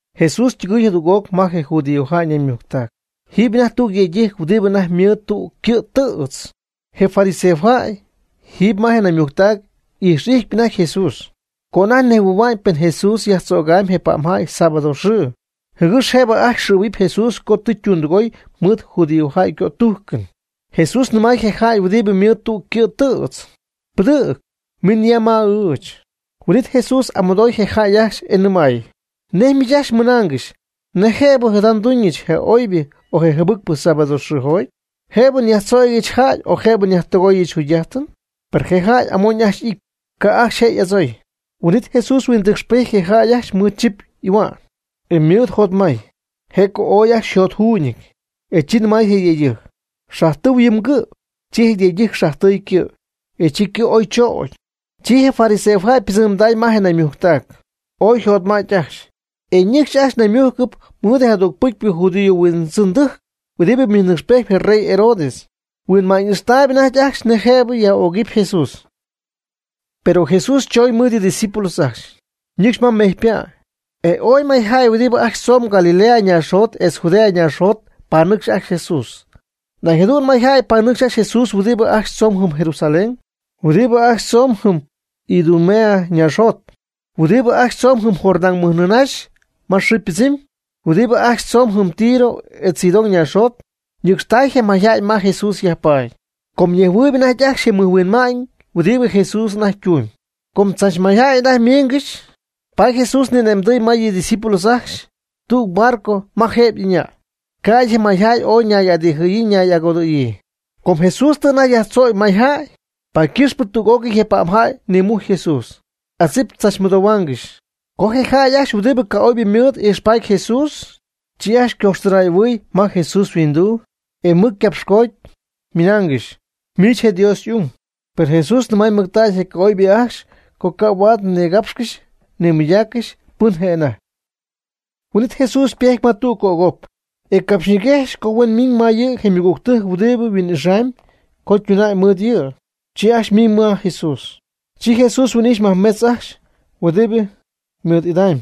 Jesús ytɨgɨy jadüg'oc ma je judío naymujctac. Jiiby anajty tüg yëydɨjc huɨdibɨ anajty ymɨɨd tüg ycɨ' tɨ̈tz. Je fariseojäy jiiby ma je naymujctac y'ijx'ijtpy anajty Jesús, co anajty nejhuɨ̈hua'ñ pen Jesús yajtzögamy je pa'mjäy sábado xɨɨ, jɨgɨx jëbɨ ajcxy xɨ̈huɨp Jesús co tɨ ytundɨgoy mɨɨd judíojäy ycötújcɨn. Jesús nɨmay je jäy huɨdibɨ mɨɨd tüg ycɨ' tɨ̈tz: ―Pɨdɨ̈g, min ya ma ɨɨch. Huin'it Jesús y'amɨdoy je jäy ajcxy e nɨmay: ―¿Nej miich ajcxy mɨnaangɨxy: Nej jëbɨ jada nduñɨch je oybɨ o je jɨbɨcpɨ sábado xɨɨjoty? ¿Jëbɨ nyajtzögɨch jäy o jëbɨ nyajtɨgoyɨch jugy'ájtɨn? Per je jäy amoñ ajcxy ijty, ca' ajcxy je' y'adzooy. Huin'it Jesús huindɨcxpejty je jäy ajcxy mɨɨd chip y'ahua'n, e mɨɨd jotmay, je' co ooy ajcxy jotjuuñɨty, e chi nɨmay je yëydɨjc: ―Xajtɨu yɨ mgɨ'. Chi je yëydɨjc xajtɨy ycɨ', e chi ycɨ' oy chögy. Chi je fariseojäy ypɨdzɨmday ma je naymujctac, ooy yjotmädy ajcxy, e ñɨcxy ajcxy ñaymújcɨp mɨɨd je jadügpɨcy judío huindzɨndɨjc huɨdibɨ ymɨjnɨcxpejt je rey Herodes. Huinma'ñ ixtaayb anajty ajcxy nej jëb ocyaj'ögɨp Jesús. Per Jesús chooñ mɨɨd yɨ' ydiscípulos ajcxy, ñɨcxy ma mejypa'. E ooy mayjäy huɨdibɨ ajcxy tzomb Galilea ñaaxjot etz Judea ñaaxjot panɨcxy ajcxy Jesús. Nañ jadu'n mayjäy panɨcx ajcxy Jesús huɨdibɨ ajcxy tzomb jɨm Jerusalén, huɨdibɨ ajcxy tzomb jɨm Idumea ñaaxjot, huɨdibɨ ajcxy tzomb jɨm Jordán mɨjnɨɨ nïnaxy ma xɨɨ ypɨdzɨmyb, huɨdibɨ ajcxy tzomb jɨm Tiro etz Sidón ñaaxjot. Ñɨcxtäy je mayjäy ma Jesús yajpaady, com ñejhuɨɨyb anajty ajcxy je mɨjhuinma'ñ huɨdibɨ Jesús anajty ytumyb. Com tzach mayjäy anajty ymiingɨxy, paady Jesús ni'ane'mdɨy ma yɨ ydiscípulos ajcxy tüg barco ma jëb ɨñäy, ca'ty je mayjäy ooy y'adijɨ̈yii y'agodɨ̈yii. Com Jesús tɨ anajty yajtzögy may jäy, paady ycɨxpɨ tüg'ócɨy je pa'mjäy nimujcy Jesús, adzip tzachnïdonaangɨxy. Co je jäy ajcxy huɨdibɨ ca'oybɨ ymɨɨd ijxpaty Jesús, chi ajcxy ñayhuɨjojtacɨ ma Jesús yhuinduu, e mɨc ycapxcooty, ymɨnaangɨxy: ―Miich je' Dios y'ung. Per Jesús nɨmay mɨctägy je ca'oybɨ ajcxy co ca' huaad nigapxcɨxy nimɨydaaccɨxy pɨn je' anajty. Huin'it Jesús ypejty ma tüg cögop, e capxyñiguexy co huen miñ ma yɨ' je ymɨgügtɨjc huɨdibɨ yhuin'ixamy co ytunam mɨɨd yɨ'. Chi ajcxy ymiñ ma Jesús. Chi Jesús yhuin'ijx majmetz ajcxy huɨdibɨ ymɨɨd'idamy,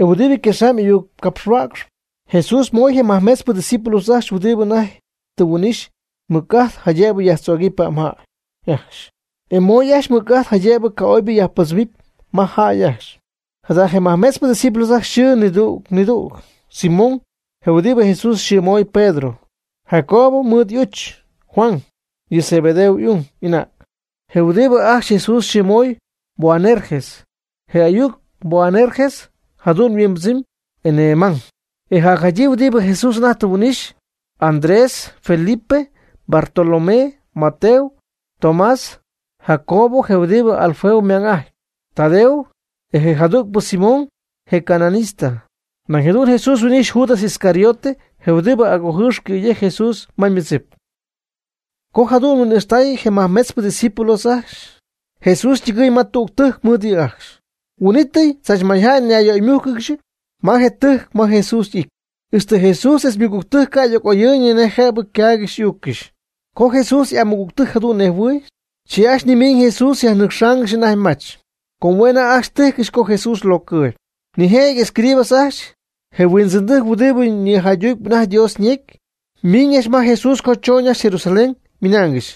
e huɨdibɨ yquexamy y'ayuccapxhuäcxp. Jesús moy je majmetzpɨ discípulos ajcxy huɨdibɨ anajty tɨ yhuin'ixy mɨc'ajt jaydëb yajtzögɨp pa'mjäy ajcxy, e ymoy ajcxy ymɨc'ajt jaydëb ca'oybɨ yajpɨdzɨmy ma jäy ajcxy. Jada je nimajmetzpɨ discípulos ajcxy yxɨɨ nidüg nidüg: Simón, je huɨdibɨ Jesús yxɨɨmoy Pedro; Jacobo mɨɨd y'uch Juan, yɨ Zebedeo y'ung y'anäg, je huɨdibɨ ajcxy Jesús yxɨɨmoy Boanerges (je ayuc Boanerges jadu'n yhuimbɨdzɨmy: “Enee ymang”). E jacjadyii huɨdib Jesús tɨ anajty huin'ixy: Andrés; Felipe; Bartolomé; Mateo; Tomás; Jacobo je huɨdibɨ Alfeo ymang'ajtpy; Tadeo; e je jadügpɨ Simón, je cananista. Nañ jadu'n Jesús huin'ijxy Judas Iscariote, je huɨdibɨ agojɨɨx cɨ̈yejc Jesús ma ymɨdzip. (Co jadu'n huin'ijxtaay je majcmetzpɨ discípulos ajcxy), Jesús ytɨgɨɨy ma tügtɨjc mɨɨd yɨ' ajcxy. Huin'ítɨy tzach mayjäy ñayyöymújcɨgɨxy ma je tɨjc ma Jesús y'ity, ixtɨ Jesús etz ymɨgügtɨjc ca' y'oyɨ̈y nej jëb ycaaygɨxy y'uuccɨxy. Co Jesús y'amɨgügtɨjc jadu'n nejhuɨɨy, chi ajcxy nimiiñ Jesús yajnɨcxaangɨxy anajty mach, com hue' anajty tíjcɨxy co Jesús ylocɨɨb. Nijëjɨty escribas ajcxy, je huindzɨndɨjc huɨdibɨ nïjaydutp anajty Dios ñecy, miin ma Jesús co choñ ajcxy Jesusalén, ymɨnaangɨxy: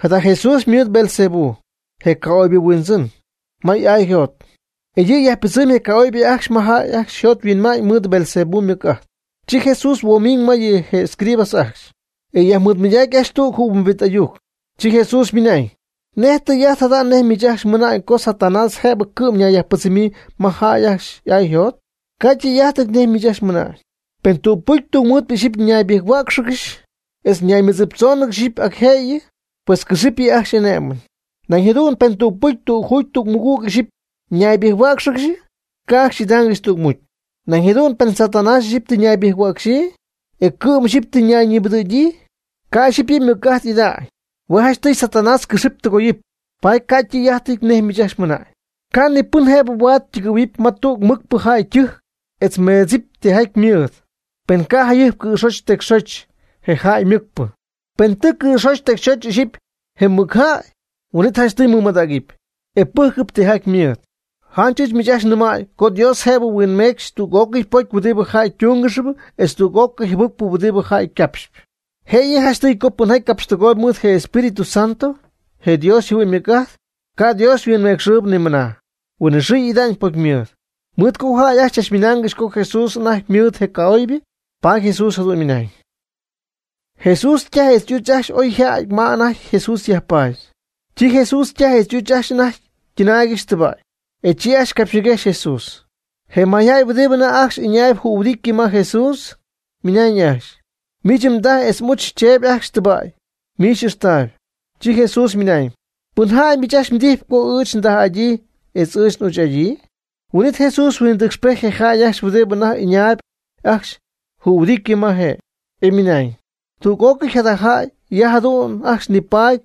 ―Jada Jesús ymɨɨd Beelzebú, je ca'oybɨ yhuindzɨn, ma y'aa yjot. E yɨ' yajpɨdzɨmy je ca'oybɨ ajcxy ma jäy ajcxy yjothuinma'ñ mɨɨd Beelzebú ymɨc'ajt. Chi Jesús huoomiñ ma yɨ' je escribas ajcxy, e yajmɨɨdmɨydacy ajcxy tüg jɨhuimbit ayuc. Chi Jesús ymɨnañ: ―¿Nej tɨy'ajt jada nej miich ajcxy mɨna'ñ co Satanás jëb cɨ'm ñayyajpɨdzɨmyii ma jäy ajcxy y'aa yjot? Ca' tɨy'ajt nej miich ajcxy mɨna'ñ. Pen tügpɨcy tungmɨɨdpɨ ixyipy ñaybɨjc-huá'cxɨgɨxy, etz ñaymɨdziptzóonɨgɨxy ixyipy ac jëyɨ. Pues cɨxɨp yɨ' ajcxy y'ané'mɨn. Nañ jadu'n pen tügpɨcy tüg juugy tüg mɨgüg ixyipy ñaybɨjc-huá'cxɨgɨxy, ca' ajcxy y'idaangɨxy tügmucy. Nañ jadu'n pen Satanás ixyipy tɨ ñaybɨjc-huäcxyii, e cɨ'm ixyipy tɨ nayñibɨdɨ̈gyii, ca' ixyipy yɨ' ymɨc'ajt ida'ñ. Hue' janchtɨy Satanás cɨxɨpy tɨgoyɨpy. (Paady ca'tɨy'ájtɨty nej miich ajcxy ymɨnañ.) Ca' ni pɨn jëb huaad ytɨgɨ̈huɨ̈p ma tüg mɨcpɨ jäy ytɨjc etz meedzɨpy tijaty ymɨɨd, pen ca' jayɨjp cɨ̈xoch tecyxoch je jäy mɨcpɨ. Pen tɨ cɨ̈xoch tecyxoch ixyipy je mɨcjäy, huin'it janchtɨy mɨmadägɨpy, e pɨ́jcɨp tijaty ymɨɨd. Janch ɨɨch miich ajcxy nɨmäy co Dios jëb huinmeecxɨp tüg'ócɨy pocy huɨdibɨ jäy ytúngɨxp etz tüg'ócɨy jɨbɨcpɨ huɨdibɨ jäy ycapxp. Jëyɨ janchtɨy co pɨnjaty capxtɨgooyb mɨɨd je Espíritu Santo, je Dios yjɨhuɨ'ñ ymɨc'ajt, ca' Dios huinmecxɨ nimɨna. Huinɨxɨɨ y'ida'ñ pocymɨɨd. Mɨɨd co jäy ajcxy chach ymɨnaangɨxy co Jesús anajty mɨɨdɨty ca'oybɨ, paady Jesús jadu'n ymɨnañ. Jesús ytaj etz y'uch ajcxy oy yja'ty ma anajty Jesús yajpaady. Chi Jesús ytaj etz y'uch ajcxy anajty ytɨnaaygɨxy tɨba'y, e chi ajcxy capxñiguejxy Jesús. Je mayjäy huɨdibɨ anajty ajcxy ɨñaayb jühuɨditɨ ma Jesús, ymɨnañ ajcxy: ―Miich mdaj etz m'uch cheeby ajcxy tɨba'y miich ixtaayb. Chi Jesús ymɨnañ: ―¿Pɨnjäy miich ajcxy mdijy co ɨɨch ndaj'adyii etz ɨɨch n'uch'adyii? Huin'it Jesús huindɨcxpejty je jäy ajcxy huɨdibɨ anajty ɨñaayb ajcxy jühuɨdity ma je', e ymɨnañ: ―Tüg'ócɨy jada jäy ya jadu'n ajcxy nipaady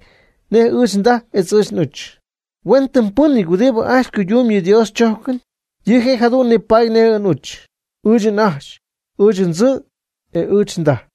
nej ɨɨch ndaj etz ɨɨch n'uch. Huenytimypɨ́nɨty huɨdibɨ ajcxy cuydumb yɨ Dios chójcɨn, yɨ' je' jadu'n nipaady nej ɨɨch n'uch, ɨɨch n'ajch, ɨɨch ndzɨ' etz ɨɨch ndaj.